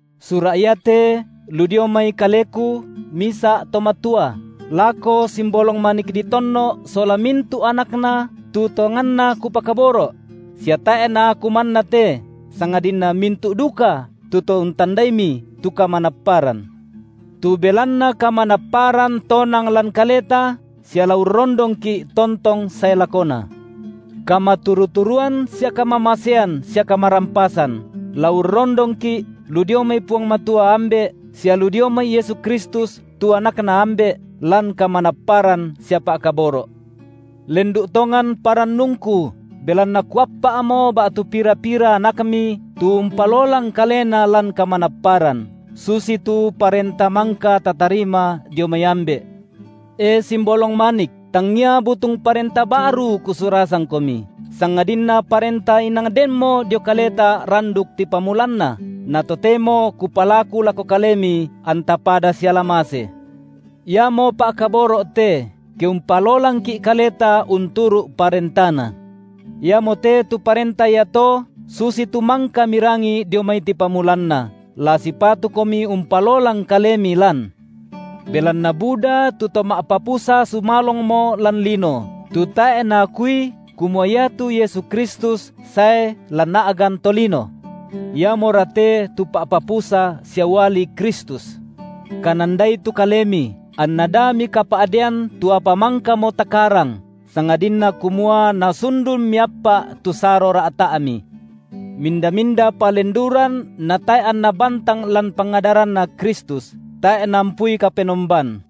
Sura’ iate lu dio mai kaleku, misa’ to matua, lako simbolong manik ditonno’ sola mintu’ anakna tu tonganna kupakaboro’; sia tae’ naaku manna te, sangadinna mintu’ duka tu to untandaimi tu kamanapparan. Tu belanna kamanapparan tonang lan kaleta, sia la urrondongki’ tontong sae lakona. Kamaturu-turuan sia kamamasean sia kamarampasan la urrondongki’ lu dio mai Puang Matua, Ambe’, sia lu dio mai Yesu Kristus, tu AnakNa Ambe’, lan kamanapparan sia pa’kaboro’. Lendu’ tongan parannungku, belanna kuappa’mo ba’tu pira-pira anakmi tu umpalolang kalena lan kamanapparan, susitu parenta mangka tatarima dio mai Ambe’. E simbolong manik, tangia butung parenta ba’ru kusurasangkomi, sangadinna parenta inang denmo dio kaleta randuk tipamulanna, na totemo kupalaku lako kalemi anta pada siala mase. Iamo pa’kaboro’ te, ke umpalolangki’ kaleta unturu’ parentaNa. Iamote tu parenta iato susitu mangka mirangi dio mai tipamulanna, la sipatukomi umpalolang kalemi lan. Belanna buda tu to ma’papusa sumalongmo lan lino, tu tae’ naakui kumua iatu Yesu Kristus sae lan a’gan tolino. Iamora te tu pa’papusa sia uali Kristus. Kanandai tu kalemi, anna da mikapa’dean tu apa mangkamo takarang, sangadinna kumua nasundun miappa’ tu saro ra’ta’mi. Minda-minda palenduran natae’ anna bantang lan pangadaranNa Kristus, tae’ naampui Kapenomban.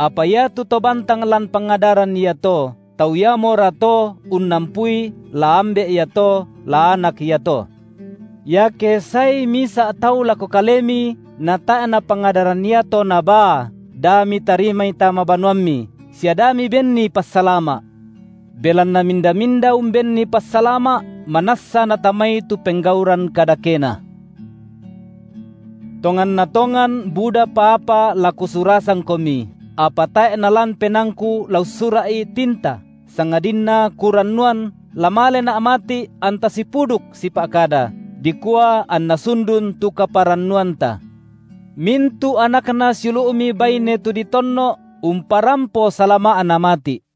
Apa iatu to bantang lan pangadaran iato, tau iamora to unnampui la Ambe’ iato, la Anak iato. Iake saei misa’ tau lako kalemi natae’ napangadaran iato nabaa, da mitarimai tama banuammi sia da mibenni passalama’. Belanna minda-minda umbenni passalama’, manassa natamai tu penggauran kadakena. Salama’na rasulu’ Tonganna tongan budapa apa la kusurasangkomi, apa tae’ nalan penaangku la ussura’i tinta, sangadinna kurannuan la malena’ mati’ anta sipuduk sipa’kada, dikua anna sundun tu kaparannuanta. Mintu’ anakna siulu’mi baine tu ditonno’ umparampo salama’na mati’.